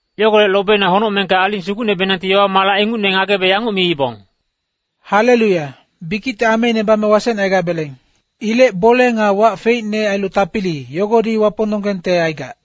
Yogolec lobeina honocmengka aling sugucnebenangti yowa-malac ingucne ngagebe yanguc miibong, “Haleluya, bikicte ameine bame wasecne aigabeleng. Ilec bole nga wac feicne ailu tapili, yogodi Wapongnonggengte aigac.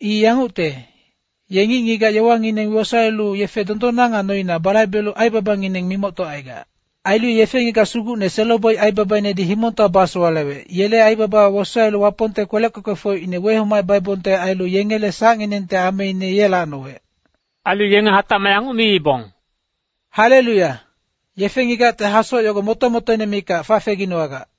I yangucte, ye ngic-ngigac yowangineng wosaelu yefe dondonna nga noina balaibelu aibabangineng mimoctocaigac. Ailu ye yefe-ngigac sugucne selo-boic aibabainedi himongtowa basowalewec, yele aibaba wosaelu Wapongte kwelec kwekwefocine wehomacebaibongte ailu yengele sacnginengte ameine ye lacnowec.” Ailu yenge hatacmac yanguc miibong, “Haleluya, yefe-ngigacte hasoc yogo moto-motoine mikac fafeginowagac.”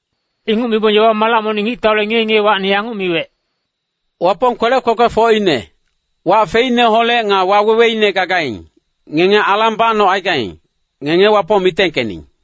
Inguc mibong yowa-malac monic ngictaule ngiye-ngiyewacni yanguc miwec, “Wapong kwelec kwekwefocine, wac feicneholec nga waweweine gagaing, ngenge alang bacnocaigaing, ngenge Wapong mitengkening.”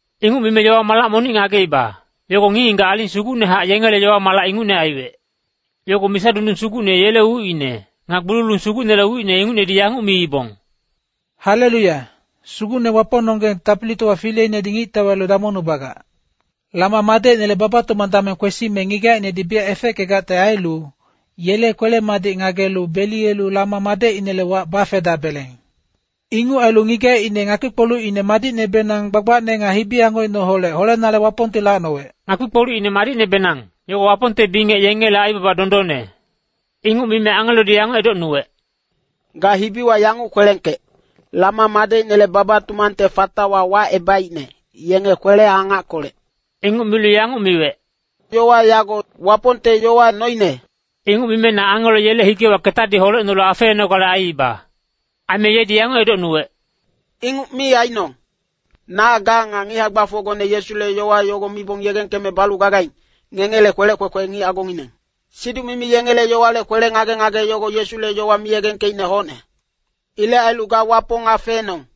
Inguc mime yowa-malac monic ngageiba, yogo ngic-ngigac aling sugucnehac yengele yowa-malac ingucne aiwec. Yogo misa dundung sugucne yele ucine, nga gbululung sugucnele ucine ingucnedi yanguc miibong, “Haleluya, Sugucne Wapongnonggeng Tapilitowa Fileinedi ngictau ailu damongnubagac. Lama madecinele baba-tumang dameng kwesime ngigacinedi biyac efeckegacte ailu, yele kwele-madic ngagelu beliyelu Lama madecinele wac bafedabeleng. Inguc ailu ngigacine ngakpi-kpolucine madicnebenang gbagbacne nga hibi-angocineholec holenale Wapongti lacnowec.” Ngakpi-kpolucine madicnebenang yogo Wapongte bingec yengele aibaba dondonne. Inguc mime angelodi yanguc edocnuwec, “Ga hibiwa yanguc kwelengkec, Lama madecinele baba-tumangte fatawa wacebaicne, yenge kwele-angackolec.” Inguc milu yanguc miwec, “Yowa yago Wapongte yowa noine.” Inguc mime na angelo yele higewa ketadi holecnolu afeenogale aiiba. Aime yedi yanguc edocnuwec, “Inguc mi ainong! Na ga nga ngic hae-gbafocgone Yesule yowa yogo mibong yegengkeme balu gagaing, ngengele kwelec kwekwe ngic agongineng. Siduc-mimi yengele yowale kwele-ngage-ngage yogo Yesule yowa miyegengkeicne hocne. Ilec ailu ga Wapong afeenong.”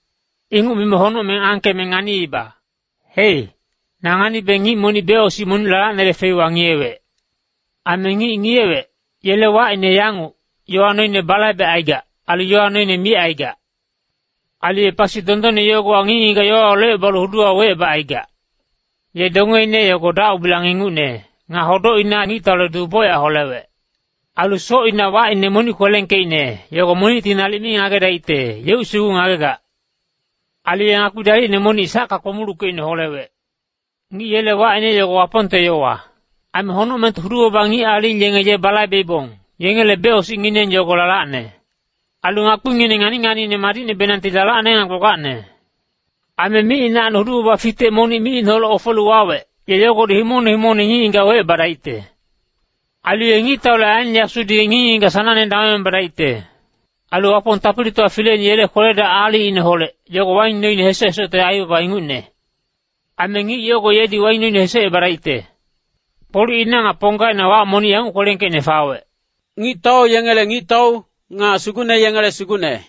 Inguc mime honocmeng angkeme nganiiba. Hei, na nganibe ngic monic becosic monic lalacnele feiwa ngiyewec. Aime ngic ngiyewec, yele wacine yanguc, Yowaine Balaibecaigac, ailu Yowa Noine micaigac. Ailu ye pasi dondonne yogowa ngic-ngigac yowawa locebalu huduwa wecebacaigac. Ye dongeine yogo dac-ubilang ingucne, nga hodocina ngictaule duu bocyac holewec. Ailu socina wacine monic kwelengkeicne, yogo monicti nalic mi ngagedaicte, yeuc sugu ngagegac. Ailu ye ngakpi dalicne monic sacka kpomuluckeicne holewec. Ngic yele wacine yogo Wapongte Yowa. Aime honocmengte hudu-baba ngic aling yenge ye balaibeibong, yengele becosicngineng yogo lalacne. Ailu ngakpingineng ngani-nganiine madicnebenangti lalacne nga gbagbacne. Aime micinacni hudu-baba fitec monic micineholec ofelu wawec, ye yogodi himongne himongne ngic-ngigac wecebadaicte. Ailu ye ngictaule aen yasudi ngic-ngigac sanangne damongebadaicte. Ailu Wapong Tapilitowa Fileine yele kwele-dac aalicineholec, yogo waing noine hesoc-hesocte aibaba ingucne. Aime ngic yogo yedi waing noine hesocebadaicte. Kpolucina nga ponggaina wac monic yanguc kwelengkeicne fawec, “Ngictau yengele Ngictau, nga sugucne yengele Sugucne.”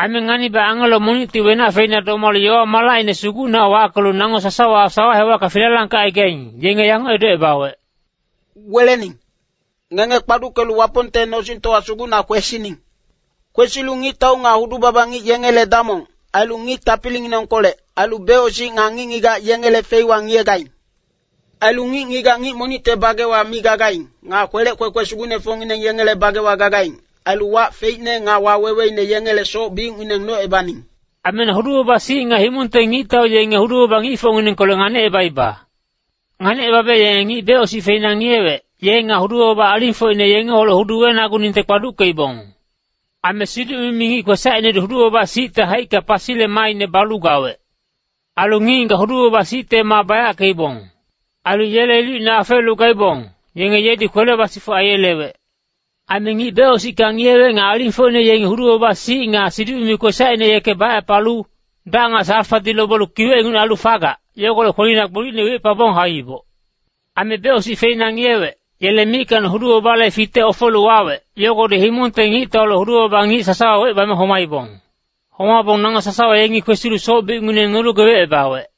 Aime nganibe angelo monicti wenac feina domalu yowa-malacine sugucnehac wackelu nango sasawa sawa hewacka filalangkecaigaing, yenge yanguc edocebawec, “Welening! Ngenge kpaduckelu Wapongte nosingtowa sugucna kwesining. Kwesilu ngictau nga hudu-baba ngic yengele damong, ailu ngic tapilinginengkolec, ailu becosic nga ngic-ngigac yengele feiwa ngiyegaing. Ailu ngic-ngigac ngic monicte bagewa mi gagaing, nga kwelec kwekwe sugucnefocngineng yengele bagewa gagaing, ailu wac feicne nga waweweine, yengele soc-biucngineng nocebaning.” Aime na hudu-baba-sic nga himongte ngictau yenge hudu-baba ngicfocnginengkolec nganicebaiba. Nganicebabe yenge ngic becosic feina ngiyewec, ye nga hudu-baba alingfocine yengeholec hudu wenaguningte kpaduckeibong. Aime siduc-mimi ngic kwesacinedi hudu-baba-sicte haicka pasile maaine balu gawec. Ailu ngic-ngigac hudu-baba-sicte maa bayackeibong. Ailu yele ilucine afeelu gaibong, yenge yedi kwele basifuc aiyelewec. Aime ngic becosicka ngiyewec nga alingfocine yengi hudu-baba-sic nga siduc-mimi ngic kwesacine yeke bacepalu, dac nga salfadi lobelu kiwec ingucne ailu fagac, yogolec kwelina gbolicne wicepabong hauiboc. Aime becosic feina ngiyewec, yele mickacni hudu-babale fitec ofelu wawec, yogodi himongte ngictaule hudu-baba ngic sasawa wecebame homaibong. Homabong nango sasawa yengi kwesilu soc-biucngineng nolu gebecebawec.